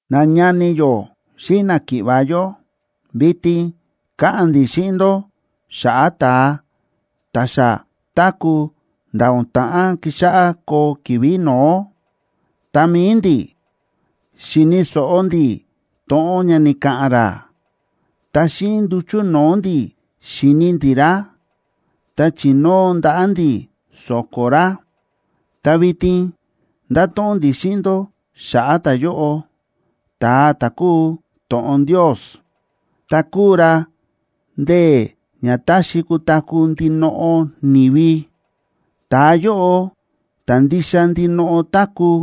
Nañani yó xíꞌin náki̱ꞌva̱ yó, vitin káꞌa̱n ndi̱ xíꞌin ndó xa̱ꞌa̱ ta̱a ta̱ xa táku̱ nda̱ o̱n ta̱ꞌán kixáꞌá koo ki̱vi̱ no̱ó. Ta mi̱i ndi̱, xi̱ni̱ so̱ꞌo ndi̱ to̱ꞌon ña ni̱ka̱ꞌa̱n ra, ta xíꞌin nduchu̱ no̱o̱ ndi̱ xi̱ni ndi̱ ra, ta chi̱nóo ndaꞌa̱ ndi̱ so̱ko̱ ra. Ta vitin ndáto̱ꞌon ndi̱ xíꞌin ndó xa̱ꞌa̱ ta̱yóꞌo, ta̱a ta̱ kúu to̱ꞌon Ndios, ta kúu ra ndee̱ ña táxi kutaku̱ ndinoꞌo ni̱vi. Ta̱a yóꞌo, ta̱ ndixa ndinoꞌo táku̱,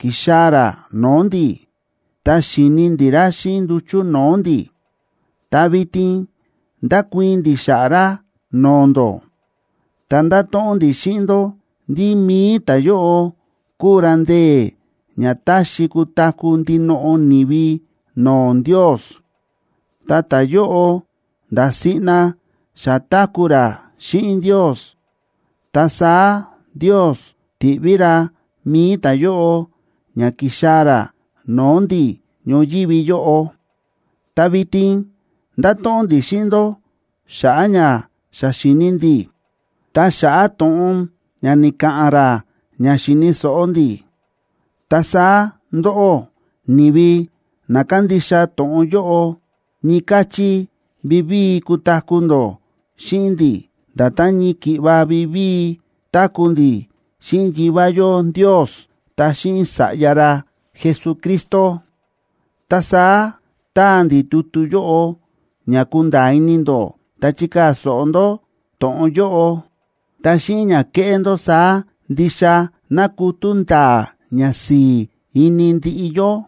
ki̱xaa̱ ra no̱o̱ ndi̱, ta xi̱ni ndi̱ ra xíꞌin nduchu̱ no̱o̱ ndi̱, ta vitin ndákuii̱n ndi̱ xa̱ꞌa̱ ra no̱o̱ ndó. Ta ndáto̱ꞌon ndi̱ xíꞌin ndó ndí mi̱i ta̱yóꞌo kúu ra ndee̱ ña táxi kutaku̱ ndinoꞌo ni̱vi no̱o̱ Ndios, ta ta̱yóꞌo nda̱ siꞌna xa táku̱ ra xíꞌin Ndios, ta saá Ndios ti̱ꞌví ra mi̱i ta̱yóꞌo ña ki̱xaa̱ ra no̱o̱ ndi̱ ñoyívi yóꞌo. Ta vitin ndáto̱ꞌon ndi̱ xíꞌin ndó xa̱ꞌa̱ ña xa xi̱ni ndi̱, ta xa̱ꞌa̱ to̱ꞌon ña ni̱ka̱ꞌa̱n ra ña xi̱ni̱ so̱ꞌo ndi̱. Ta saá ndóꞌó, ni̱vi na kándixa to̱ꞌon yóꞌo, ñii káchí vivíi kutaku̱ ndó xíꞌin ndi̱, nda̱tán ñii ki̱ꞌva vivíi táku̱ ndi̱ xíꞌin Yivá yó Ndios ta xíꞌin Sa̱ꞌya ra Jesucristo. Ta saá táa ndi̱ tutu yóꞌo ña kunda̱a̱ ini ndó ta chikaa̱ so̱ꞌo ndó to̱ꞌon yóꞌo. Ta xíꞌin ña keꞌé ndó saá ndixa ná kutú nda̱a̱ ñasi̱i̱ ini ndiꞌi yó.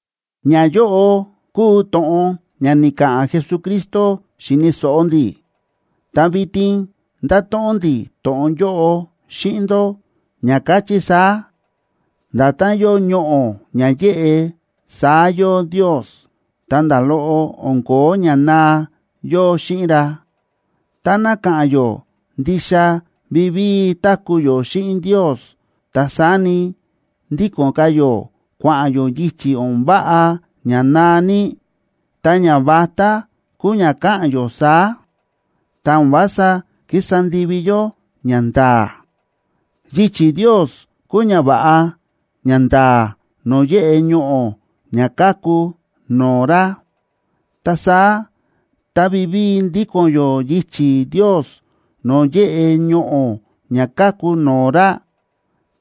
Ñayóꞌo kúu to̱ꞌon ña ni̱ka̱ꞌa̱n Jesucristo xi̱ni̱ so̱ꞌo ndi̱, ta vitin ndáto̱ꞌon ndi̱ to̱ꞌon yóꞌo xíꞌin ndó, ña káchí saá: Nda̱tán yóo ñoꞌo̱ ña yéꞌe, saá yóo Ndios, ta nda̱ loꞌo o̱n ko̱ó ña naa yóo xíꞌin ra. Táná ka̱ꞌa̱n yó ndixa vivíi táku̱ yó xíꞌin Ndios, ta saá ni, ndíko̱n ka̱ yó kua̱ꞌa̱n yó yichi̱ o̱n váꞌa ña naa ní, ta ñavatá kúu ña ka̱ꞌa̱n yó saá, ta o̱n vása kísa ndivi yó ñanda̱a̱. Yichi̱ Ndios kúu ñava̱ꞌa ñanda̱a̱ no̱o̱ yéꞌe ñoꞌo̱ ña káku no̱o̱ ra. Ta saá tá vivíi ndíko̱n yó yichi̱ Ndios no̱o̱ yéꞌe ñoꞌo̱ ña káku no̱o̱ ra,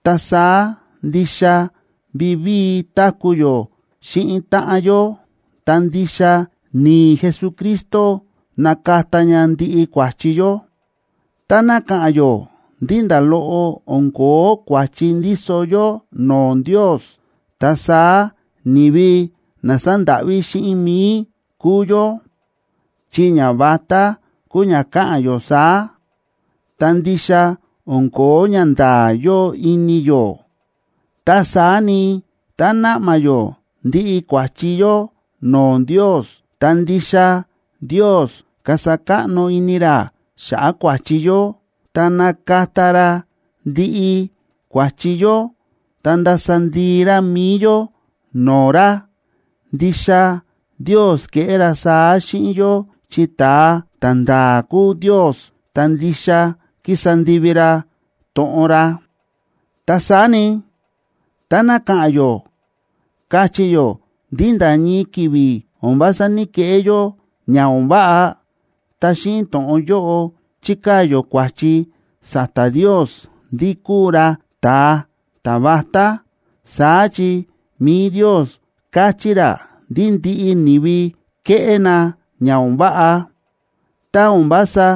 ta saá ndixa vivíi táku̱ yó xíꞌin táꞌan yó, ta ndixa ni̱i̱ Jesucristo nákata ña ndiꞌi kua̱chi yó. Táná ka̱ꞌa̱n yó ndí nda̱ loꞌo o̱n ko̱ó kua̱chi ndíso yó no̱o̱ Ndios, ta saá ni̱vi na sándáꞌví xíꞌin mi̱i kúu yó, chi ñavatá kúu ña ka̱ꞌa̱n yó saá, ta ndixa o̱n ko̱ó ñanda̱a̱ yóo ini yó. Ta saá ni, tá naꞌma yó ndiꞌi kua̱chi yó no̱o̱ Ndios, ta ndixa Ndios kasa káꞌno ini ra xa̱ꞌa̱ kua̱chi yó, ta nakata ra ndiꞌi kua̱chi yó, ta ndasa ndii ra mi̱i yó no̱o̱ ra. Ndixa Ndios keꞌé ra saá xíꞌin yó, chi ta̱a ta̱nda̱a̱ kúu Ndios ta ndixa kísa ndivi ra to̱ꞌon ra. Ta saá ni, táná ka̱ꞌa̱n yó, káchí yó ndí nda̱ ñii ki̱vi̱ o̱n vása ní‑keꞌé yó ña o̱n váꞌa, ta xíꞌin to̱ꞌon yóꞌo chíkaa̱ yó kua̱chi sa̱ta̱ Ndios ndí kúu ra ta̱a ta̱vatá. Saá chi mi̱i Ndios káchí ra ndí ndiꞌi ni̱vi kéꞌé na ña o̱n váꞌa. Tá o̱n vása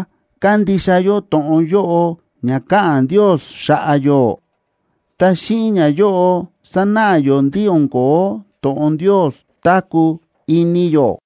kándixa yó to̱ꞌon yóꞌo ña káꞌa̱n Ndios xa̱ꞌa̱ yó, ta xíꞌin ñayóꞌo sánáꞌa yó ndí o̱n ko̱ó to̱ꞌon Ndios táku̱ ini yó.